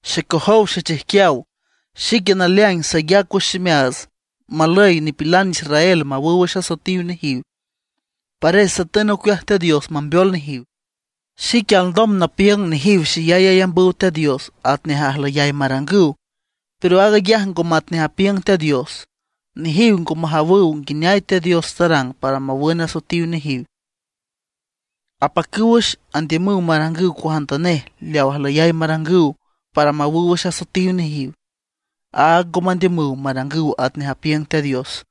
Xecojow xechijquiaw, xique naleaing sayac wüx ximeaats malüy nipilan israel mawüw wüx asoetiw nejiw, pares satün ocueaj Teat Dios mambeol nejiw. Xique alndom napiüng nejiw xeyay ayambüw Teat Dios atnej ajlüyay marangüw, pero aag ayaj ngo matnej apiüng Teat Dios. Nejiw ngo majawüw nguineay Teat Dios tarang para mawün asoetiw nejiw. Apacüw wüx andiümüw marangüw cuajantanej leaw ajlüyay marangüw para mawüw wüx asoetiw nejiw. Áag ngo mandiümüw marangüw atnej apiüng Teat Dios.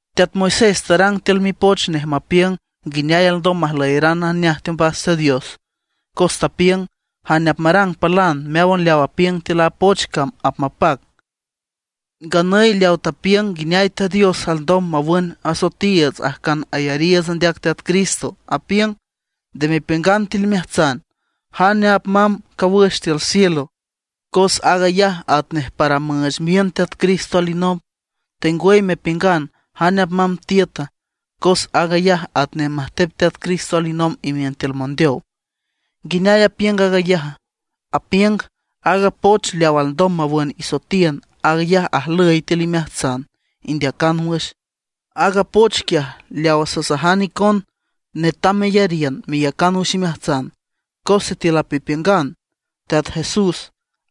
Teat Moisés tarang tiül mipoch nej mapiüng nguineay alndom majlüyaran najneaj teombas Teat Dios, cos tapiüng: “Jane apmarang palan meáwan leaw apiüng tiül a poch cam apmapac”. Nganüy leaw tapiüng nguineay Teat Dios alndom mawün asoetiiüts ajcan ayariiüts andeac Teat Cristo apiüng: “Nde mepiüngan tiül imeajtsan: ¿Jane apmamb cawüx tiül cielo? ―cos aag ayaj atnej para müüch miün Teat Cristo alinomb―; tengwüy mepiüngan: ¿Jane apmamb tiüta?” ―cos aag ayaj atnej majtep Teat Cristo alinomb imiün tiül mondeow. ¿Nguineay apiüng aag ayaja? Apiüng: “Aaga poch leaw alndom mawün isoetiün, aag ayaj ajlüy tiül imeajtsan, indeacan wüx”. Aaga poch quiaj leawa sasajan icon netam meyariün, meyacan wüx imeajtsan. Cos sitiül apmepiüng Teat Jesús,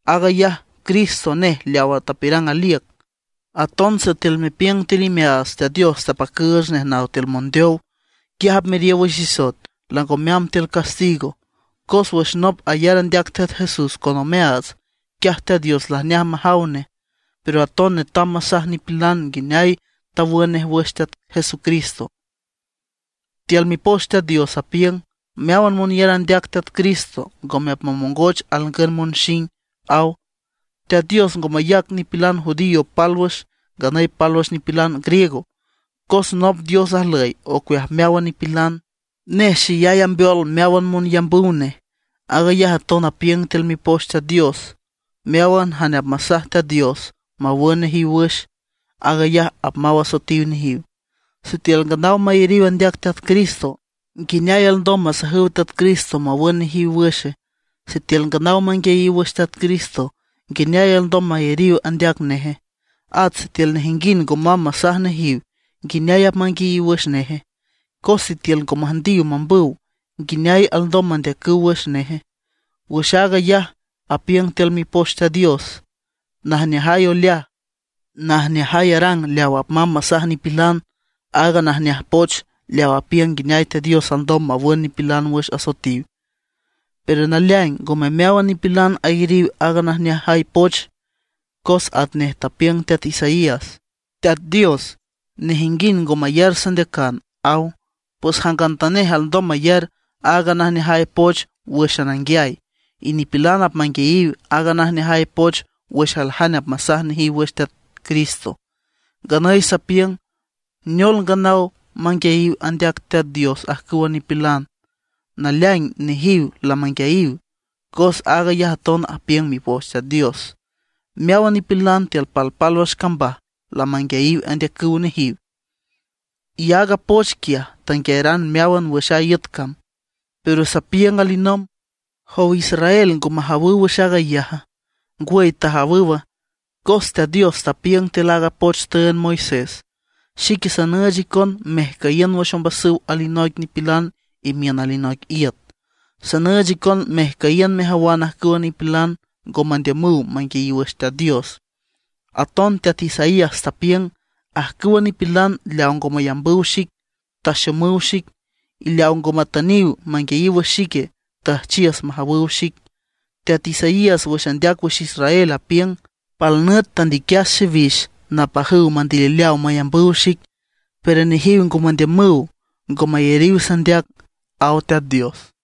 aag ayaj Cristo nej leawa tapiürang aliüc, aton sitiül mepiüng tiül imeaats Teat Dios tapacüüch nej naw tiül mondeow, quiaj apmeriow wüx isoet, lango meamb tiül castigo. Cos wüx nop ayar andeac Teat Jesús con omeaats, quiaj Teat Dios lajneaj majaw nej. Pero aton netam masaj nipilan nguineay tawün nej wüx Teat Jesucristo. Tiül Mipoch Teat Dios apiüng: “Meáwan monyar andeac Teat Cristo, ngome apmamongoch alngün monxing”, aw. Teat Dios ngo mayac nipilan judío pálwüx, nganüy pálwüx nipilan griego, cos nop Dios ajlüy ocueaj meáwan nipilan; nej xeyay ambeol meáwan monyambüw nej. Aag ayaj aton apiüng tiül Mipoch Teat Dios: “Meáwan jane apmasaj Teat Dios mawün nejiw wüx, aag ayaj apmaw asoetiw nejiw”. Sitiül nganaw mayariw andeac Teat Cristo, ¿nguineay alndom masajüw Teat Cristo mawün nejiw wüxe? Sitiül nganaw manguiayiw wüx Teat Cristo, ¿nguineay alndom mayariw andeac neje? At sitiül nejinguind ngo mamb masaj nejiw, ¿nguineay apmanguiayiw wüx neje? Cos sitiül ngo müjndiw mambüw, ¿nguineay alndom mandeacüw wüx neje? Wüx aag ayaj apiüng tiül Mipoch Teat Dios: “¡Najneajay oleaj, najneajay arang leaw apmamb masaj nipilan aaga najneaj poch leaw apiüng nguineay Teat Dios alndom mawün nipilan wüx asoetiw!” Pero naleaing ngome meáwan nipilan ayariw aaga najneajay poch, cos atnej tapiüng teat Isaías: “Teat Dios, nejinguind ngo mayar sandeacan”, aw. Pues jangantanej alndom mayar aaga najneajay poch wǘxan anguiay; y nipilan apmanguiayiw aaga najneajay poch wüx aljane apmasaj nejiw wüx Teat Cristo. Nganüy sapiüng: ¿Neol, nganaw manguiayiw andeac Teat Dios ajcüwa nipilan? ¡Naleaing nejiw lamanguiayiw! Cos aag ayaj aton apiüng Mipoch Teat Dios: Meáwan nipilan tiül palpálwüx cambaj lamanguiayiw andeacüw nejiw, y aaga poch quiaj tanguiayaran meáwan wüx a iüt cam. Pero sapiüng alinomb: ¿Jow Israel, ngo majawüw wüx aag ayaja? Ngwüy tajawüw, cos Teat Dios tapiüng tiül aaga poch tüünd Moisés: Xique sanüüch icon mejcüyiün wüx ombasüw alinoic nipilan imiün alinoic iüt; sanüüch icon mejcüyiün mejawan ajcüwa nipilan ngo mandiümüw manguiayiw wüx Teat Dios. Aton Teat Isaías tapiüng: Ajcüwa nipilan leaw ngo mayambüw xic, taxomüw xic; y leaw ngo matüniw manguiay wüx xique, tüjchiüs majawüw xic. Teat Isaías wüx andeac wüx Israel, apiüng: “Pal nüt tandiquias xiwix napajüw mandilileaw mayambüw xic, pero nejiw ngo mandiümüw, ngo mayariw sandeac”, aw Teat Dios.